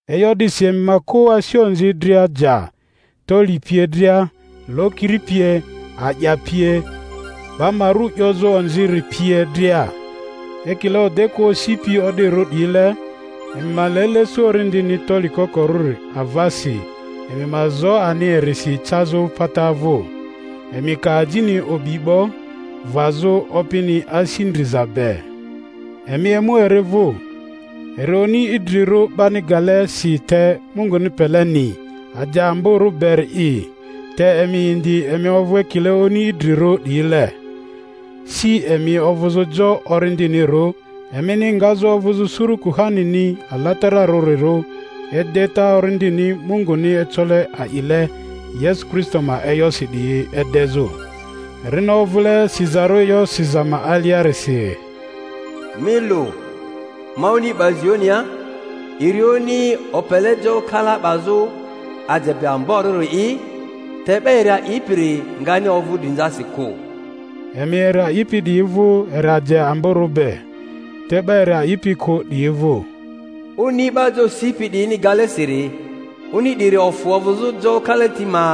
E'yo 'disi emi ma kᴜ asi onzi dria ja toli pie dria, lokiri pie, a'ya pie, 'ba ma ru 'yozᴜ onziri pie dria. Ekile odekᴜa osipi o'dirᴜ 'diyile, emi ma le lesu orindini toli kokorᴜri avasi, emi ma zo ani erisi cazᴜ pata vᴜ; emi ka ajini o'bi 'bo, vazᴜ Opini asi ndriza be. Emi emu eri vᴜ, eri oni idrirᴜ 'bani gale si te Munguni peleni, aje amborᴜ beri'i; te emi indi, emi ovᴜ ekile oni idrirᴜ 'diyile, si emi ovᴜzᴜ jo orindinirᴜ, emini ngazᴜ ovᴜzᴜ suru kuhanini alatararᴜrirᴜ, edeta orindini Munguni ecole a'ile Yesu Kristo ma e'yosi 'diyi edezᴜ. Erini ovᴜle sizarᴜ e'yo siza ma aliarisi: Mi lu, ma oni 'ba Zionia, eri oni opele jo kala 'bazᴜ, aje be amborᴜri'i, te 'ba eri a'ipiri ngani ovᴜ drinzasi kᴜ. Emi eri a'ipi 'diyi vᴜ eri aje be amborᴜ, te 'ba eri a'ipi kᴜ 'diyi vᴜ, Oni 'ba jo sipi 'diyini gale siri, oni 'diri ofᴜ ovᴜzᴜ jo kalati ma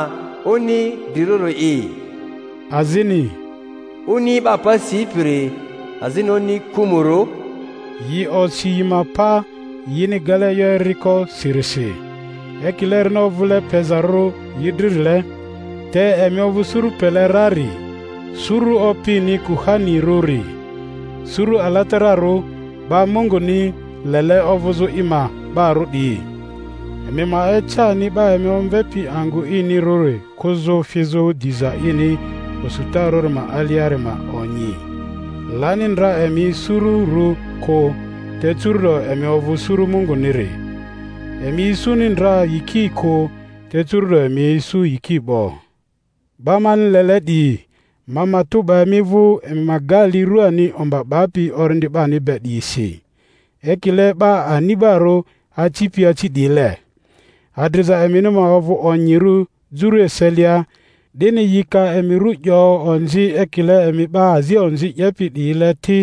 oni drirᴜri'i; azini Oni 'ba pa sipiri azini oni kᴜmᴜrᴜ; yi osi yi ma pa yini gale e'yo eriko sirisi, ekile erini ovᴜle pezarᴜ yi dririle. Te emi ovᴜ suru pele rari, suru opini kuhanirᴜri, suru alatararᴜ, 'ba Munguni lele ovᴜzᴜ i ma 'barᴜ 'diyi, emi ma ece ani 'ba emi omvepi angᴜ inirᴜri kᴜzᴜ fizᴜ diza ini osutarᴜri ma aliari ma onyi. Lani ndra emi sururᴜ kᴜ, te curu'do emi ovᴜ suru Munguniri; emi isuni ndra yiki kᴜ, te curu'do emi isu yiki 'bo. 'Ba mani lele 'diyi, ma matᴜ 'ba emi vᴜ emi ma ga li ruani omba 'bapi orindi 'bani be 'diyi si, ekile 'ba ani'barᴜ acipi aci 'diyile. Adriza emini ma ovᴜ onyirᴜ juru eselia, 'dini yi ka emi ru 'yo onzi ekile emi 'ba azi onzi 'yepi 'diyile ti,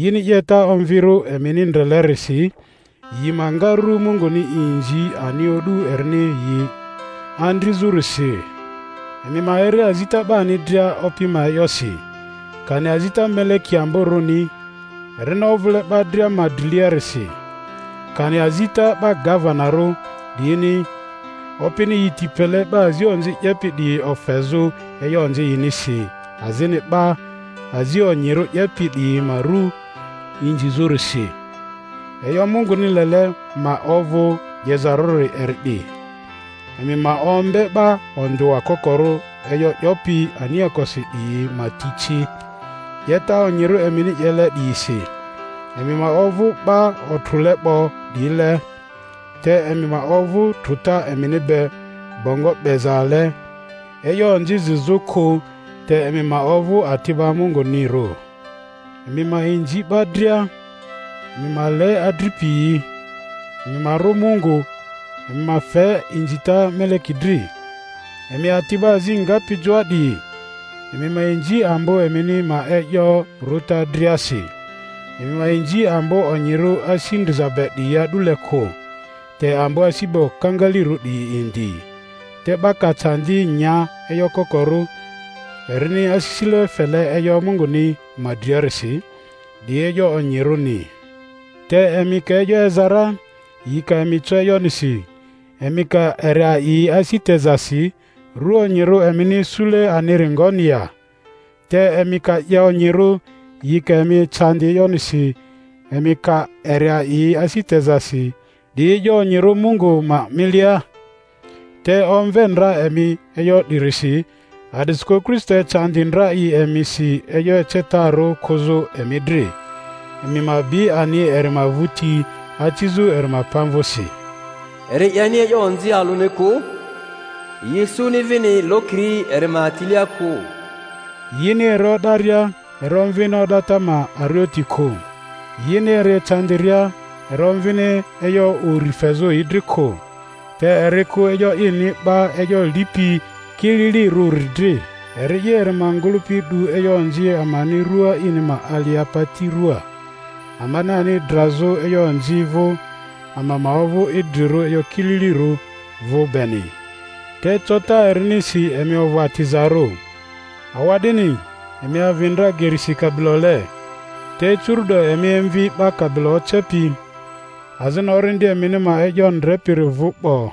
yini 'yeta onvirᴜ emini ndrelerisi yi ma nga ru Munguni inzi ani o'du erini yi andrizᴜrisi. Emi ma eri azita 'bani dria Opi ma e'yosi, kani azita meleki ambᴜrᴜni erini ovᴜle 'ba dria ma driliarisi, kani azita 'ba gavenarᴜ 'diyini, opini yi ti pele 'ba azi onzi 'yepi 'diyi ofezᴜ e'yo onzi yinisi azini 'ba azI onyirᴜ 'yepi 'diyi ma ru inzizᴜrisi. E'yo Munguni lele ma ovᴜ 'yezarᴜri eri 'di, eMi ma ombe 'ba ondᴜa kokoro e'yo 'yopi aniakosi 'diyi ma ti ci, 'yeta onyirᴜ emini 'yele 'diyisi. Emi ma ovᴜ 'ba otrᴜle 'bo 'diyile, te emi ma ovᴜ trᴜta emini be bongo 'bezale e'yo onzi zizᴜ kᴜ; te emi ma ovᴜ ati'ba Mungunirᴜ. Emi ma inzi 'ba dria. Emi ma le adripiyi. Emi ma rᴜ Mungu. Emi ma fe inzita meleki dri. Emi ati'ba azi ngapi joa 'diyi, emi ma inzi ambo emini ma e'yo rᴜta driasi; emi ma inzi ambo onyirᴜ asi ndriza be 'diyi a'dule kᴜ, te ambo asi be okangalirᴜ 'diyi indi. Te 'ba ka candi nya e'yo kokorᴜ, erini asisile fele e'yo Munguni ma driarisi, 'di e'yo onyirᴜni. Te emi ka e'yo eza ra, yi ka emi co e'yonisi, emi ka eri a'i asi tezasi, ru onyirᴜ emini isule aniri ngoni ya? Te emi ka 'ye onyirᴜ, yi ka emi ecandi e'yonisi, emi ka eri a'i asi tezasi, 'di e'yo onyirᴜ Mungu ma milia. Te omve ndra emi e'yo 'dirisi, a'disikᴜ Kristo ecandi ndra i emisi, e'yo ecetarᴜ kᴜzᴜ emi dri, emi ma bi ani eri ma vᴜti acizᴜ eri ma pamvᴜsi. Eri 'yeni e'yo onzi alᴜni kᴜ; yi isuni vini lokiri eri ma tilia kᴜ. Yini eri o'daria eri omvini o'data ma arioti kᴜ; yini eri ecandiria eri omvini e'yo uri fezᴜ yi dri kᴜ; te eri kᴜ e'yo ini 'ba e'yo lipi kililirᴜri dri. Eri'i eri ma ngᴜlᴜpi 'du e'yo onzi amani rᴜa ini ma alia pati ruaa, amani ani drazᴜ e'yo onzi vᴜ, ama ma ovᴜ idrirᴜ e'yo kililirᴜ vᴜ beni; te cota erinisi emi ovᴜ atizarᴜ. Awa'dini, emi avi ndra gerisi kabilole, te curu'do emi emvi 'Ba kabilo Ocepi, azini orindi emini ma e'yo Ndrepiri vᴜ 'bo.